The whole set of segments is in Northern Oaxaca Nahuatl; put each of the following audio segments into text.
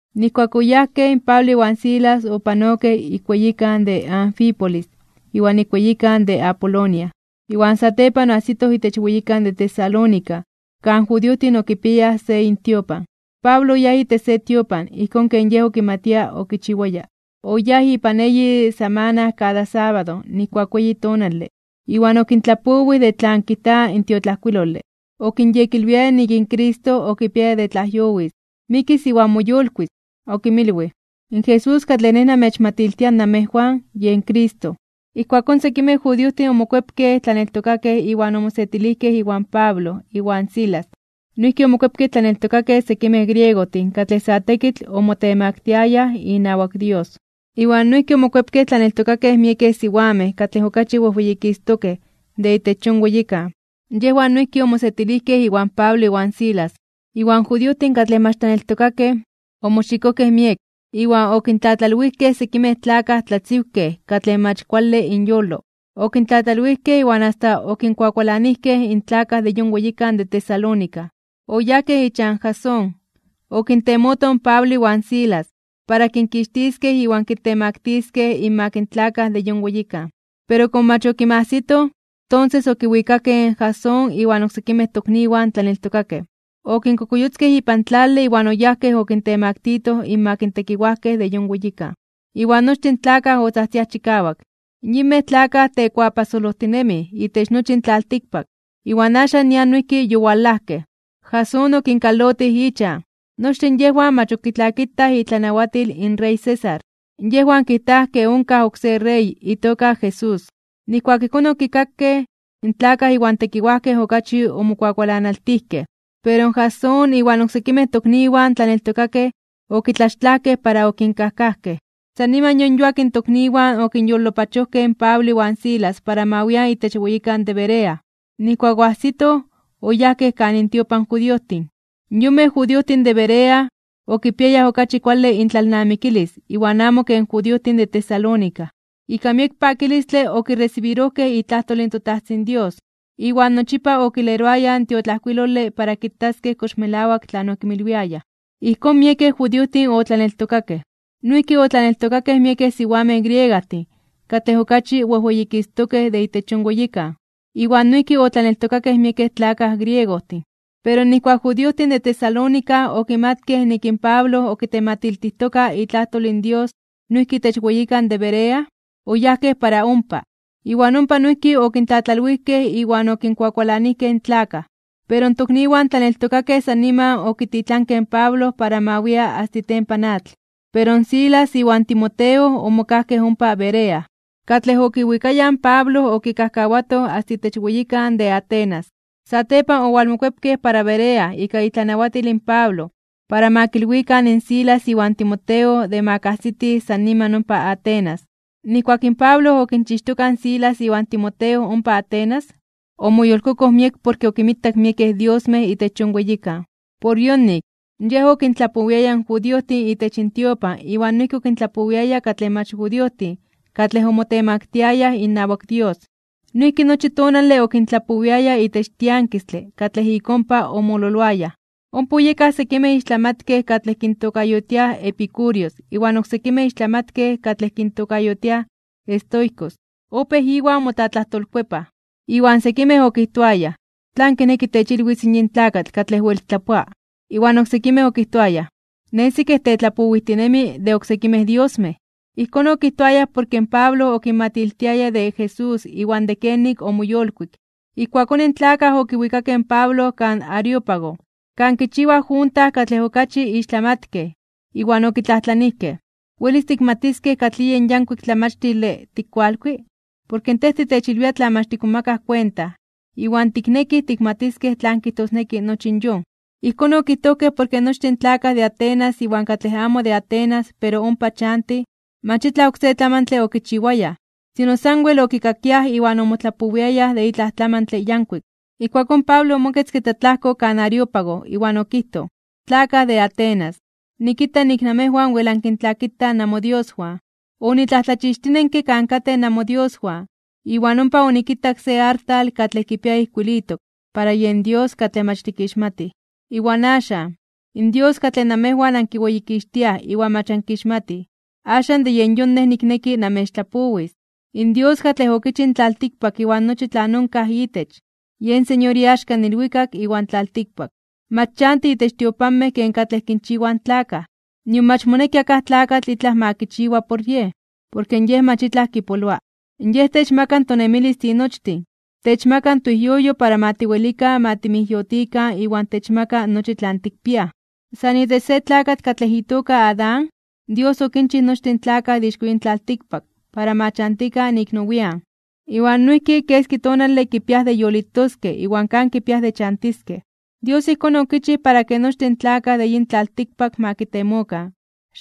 Nijkuak oyajkej, in Pablo iwan Silas opanokej ik weyikan de Anfípolis iwan ik weyikan de Apolonia, iwan satepan oajsitoj itech weyikan de Tesalónica, kan judiojtin okipiayaj se intiopan. Pablo oyáj itech se tiopan, ijkón ken yej okimatia okichiwaya, oyáj ipan eyi samana kada sábado nijkuak weyi tonale iwan okintlapowij de tlan kijta in tiotlajkuilole. Okinyekilwiaya nik in Cristo okipiaya de tlajyowis, mikis iwan moyolkuis (moyolitis). Okinmilwij: ―In Jesús katlej nej namechmatiltia namejwan, yen Cristo. Ijkuakón sekimej judiojtin omokuepkej tlaneltokakej iwan omosetilijkej iwan Pablo iwan Silas. Noijki omokuepkej tlaneltokakej sekimej griegojtin katlej sa tekitl omotemaktiayaj inawak Dios, iwan noijki omokuepkej tlaneltokakej miekej siwamej katlej okachi wejweyikistokej (wejweyititokej) de itech yon weyikan. Yejwan noijki omosetilijkej iwan Pablo iwan Silas. Iwan judiojtin katlej mach tlaneltokakej, omoxikojkej miek, iwan okintlatlalwijkej sekimej tlakaj tlatziwkej katlej mach kuale inyolo. Okintlatlalwijkej iwan asta okinkuakualanijkej in tlakaj de yon weyikan de Tesalónica. Oyajkej ichan Jasón, okintemotoj in Pablo iwan Silas, para kinkixtiskej iwan kintemaktiskej (kintemaktiliskej) inmak in tlakaj de yon weyikan. Pero komo mach okinmajsitoj, tonses okiwikakej in Jasón iwan oksekimej tokniwan tlaneltokakej, okinkokuyotzkej ipan tlale iwan oyajkej okintemaktitoj (okintemaktilitoj) innawak tekiwajkej de yon weyikan. Iwan nochtin tlakaj otzajtziaj chikawak: ―¡Yinmej tlakaj tekuapajsolojtinemij (tekuatlapololtijtinemij) itech nochi in tlaltikpak, iwan axan nian noijki yowalajkej! ¡Jasón okinkalotij ichan! Nochtin yejwan mach ok kitlakitaj itlanawatil in rey César. Yejwan kijtaj ke onkaj oksé rey, itoka Jesús. Nijkuak ijkón okikakej, in tlakaj iwan tekiwajkej okachi omokuakualanaltijkej. Pero in Jasón iwan oksekimej tokniwan tlaneltokakej okitlaxtlajkej para okinkajkajkej. San niman yon yuak in tokniwan okinyolopachojkej in Pablo iwan Silas para ma wian itech weyikan de Berea. Nijkuak oajsitoj, oyajkej kan intiopan in judiojtin. Yonmej judiojtin de Berea okipiayaj okachi kuale intlalnamikilis iwan amo ken judiojtin de Tesalónica, ika miek pakilistle okiresibirojkej itlajtol in toTajtzin Dios, iwan nochipa okileroayaj in tiotlajkuilole para kitaskej kox melawak tlan okinmilwiayaj. Ijkón, miekej judiojtin otlaneltokakej. Noijki otlaneltokakej miekej siwamej griegajtin katlej okachi wejweyikistokej (wejweyititokej) de itech yon weyikan, iwan noijki otlaneltokakej miekej tlakaj griegojtin. Pero nijkuak in judiojtin de Tesalónica okimatkej nik in Pablo okitematiltijtoka itlajtol in Dios noijki itech weyikan de Berea, oyajkej para ompa. Iwan ompa noijki okintlatlalwijkej iwan okinkuakualanijkej in tlakaj. Pero in tokniwan tlaneltokakej san niman okititlankej in Pablo para ma wia asta itempan atl, pero in Silas iwan Timoteo omokajkej ompa Berea. Katlej okiwikayaj in Pablo okikajkawatoj asta itech weyikan de Atenas. Satepan owalmokuepkej para Berea ika itlanawatil in Pablo para ma kilwikan in Silas iwan Timoteo de ma kajsitij san niman ompa Atenas. Nijkuak in Pablo okinchixtoka in Silas iwan Timoteo ompa Atenas, omoyolkokoj miek porke okinmitak miekej diosmej itech yon weyikan. Por yonik, yej okintlapowiaya in judiojtin itech intiopan iwan noijki okintlapowiaya katlej mach judiojtin katlej omotemaktiayaj inawak Dios. Noijki nochi tonale okintlapowiaya itech tiankistle katlej ik ompa omololoayaj. Ompa oyekaj sekimej ixtlamatkej katlej kintokayotiaj epicúreos iwan oksekimej ixtlamatkej katlej kintokayotiaj estoicos, opéj iwan motlatlajtolkuepaj. Iwan sekimej okijtoayaj: ―¿Tlan kineki techilwis yin tlakatl katlej wel tlapoa? Iwan oksekimej okijtoayaj: ―Nesi ke tetlapowijtinemi de oksekimej diosmej. Ijkón okijtoayaj porke Pablo okinmatiltiaya de Jesús iwan de kenik omoyolkuik. Ijkuakón in tlakaj okiwikakej in Pablo kan Areópago, kan kichiwaj junta katlej okachi ixtlamatkej, iwan okitlajtlanijkej: ―¿Welis tikmatiskej katlij yen yankuik tlamachtile tikkualkui? Porke tej titechilwia tlan mach tikmomakaj kuenta, iwan tiknekij tikmatiskej tlan kijtosneki nochi yon. Ijkón okijtojkej porke nochtin tlakaj de Atenas iwan katlej amo de Atenas pero ompa chantij, mach itlaj oksé tlamantle okichiwayaj, sino sanwel okikakiaj iwan omotlapowiayaj de itlaj tlamantle yankuik. Ijkuakón Pablo omoketzke tlatlajko kan Areópago, iwan okijtoj: ―Tlakaj de Atenas, nikita nik namejwan wel ankintlakitaj namodioswan. Onitlajtlachixtinenke kan katej namodioswan, iwan ompa onikitak se artal katlej kipia ijkuilitok: “Para yen Dios katlej mach tikixmatij”. Iwan axan, in Dios katlej namejwan ankiweyikixtiaj iwan mach ankixmatij, axan de yen yon nej nikneki namechtlapowis. ’In Dios katlej okichij in tlaltikpak iwan nochi tlan onkaj itech, yen Señor iaxka in ilwikak iwan tlaltikpak. Mach chanti itech tiopanmej ken katlej kinchiwaj in tlakaj, nion mach moneki akaj tlakatl itlaj ma kichiwa por Yej, porke Yej mach itlaj kipoloa. Yej techmaka tonemilis tinochtin, techmaka toijyoyo para ma tiwelikan ma timijyotikan iwan techmaka nochi tlan tikpiaj. ’San itech se tlakatl katlej itoka Adán, Dios okinchij nochtin in tlakaj de ixko yin tlaltikpak para ma chantikan ik nowian (nian nepa), iwan noijki keski tonale kipiaj de yolitoskej iwan kan kipiaj de chantiskej. Dios ijkón okichij para ke nochtin in tlakaj de yin tlaltikpak ma kitemokan,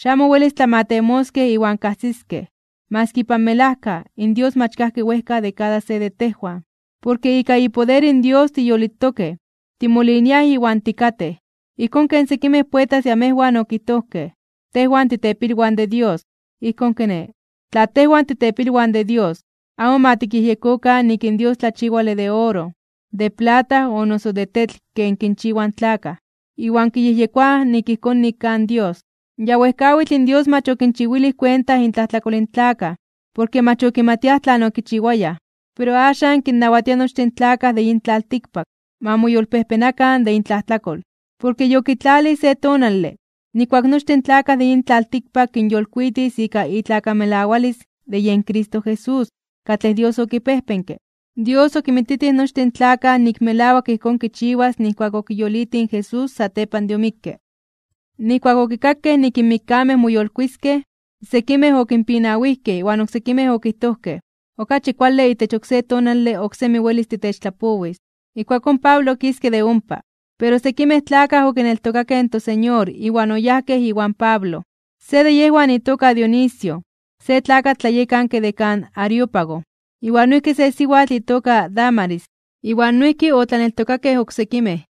xamo welis tlamatemoskej iwan kajsiskej, maski ipan melajka, in Dios mach kajki wejka de kada se de tejwan. Porke ika ipoder in Dios tiyolitokej, timoliniaj iwan tikatej. Ijkón ken sekimej poetas de amejwan okijtojkej: “Tejwan titepilwan de Dios.” Ijkón kiné, tla tejwan titepilwan de Dios, amo ma tikyejyekokan nik in Dios tlachiwale de oro, de plata o noso de tetl ken kinchiwaj in tlakaj, iwan kiyejyekoaj ijkón nik kaj in Dios. Ya wejkawitl in Dios mach okinchiwilij kuenta intlajtlakol in tlakaj, porke mach okimatiaj tlan okichiwayaj, pero axan kinnawatia nochtin in tlakaj de yin tlaltikpak, ma moyolpejpenakan (ma moyolkuepakan) de intlajtlakol. Porke yokitlalij se tonale, nijkuak nochtin in tlakaj de yin tlaltikpak kinyolkuitis ika itlakamelawalis de yen Cristo Jesús katlej Dios okipejpenke. Dios okinmititij nochtin in tlakaj nik melawak ijkón kichiwas nijkuak okiyolitij in Jesús satepan de omikke. Nijkuak okikakej nik in mikkamej moyolkuiskej (moyolitiskej), sekimej okipinawijkej iwan oksekimej okijtojkej: ―Okachi kuale itech oksé tonale oksemi welis titechtlapowis. Ijkuakón in Pablo okiske de ompa. Pero sekimej tlakaj okineltokakej in toSeñor iwan oyajkej iwan Pablo. Se de yejwan itoka Dionisio, se tlakatl tlayekanke de kan Areópago, iwan noijki se siwatl itoka Dámaris, iwan noijki otlaneltokakej oksekimej.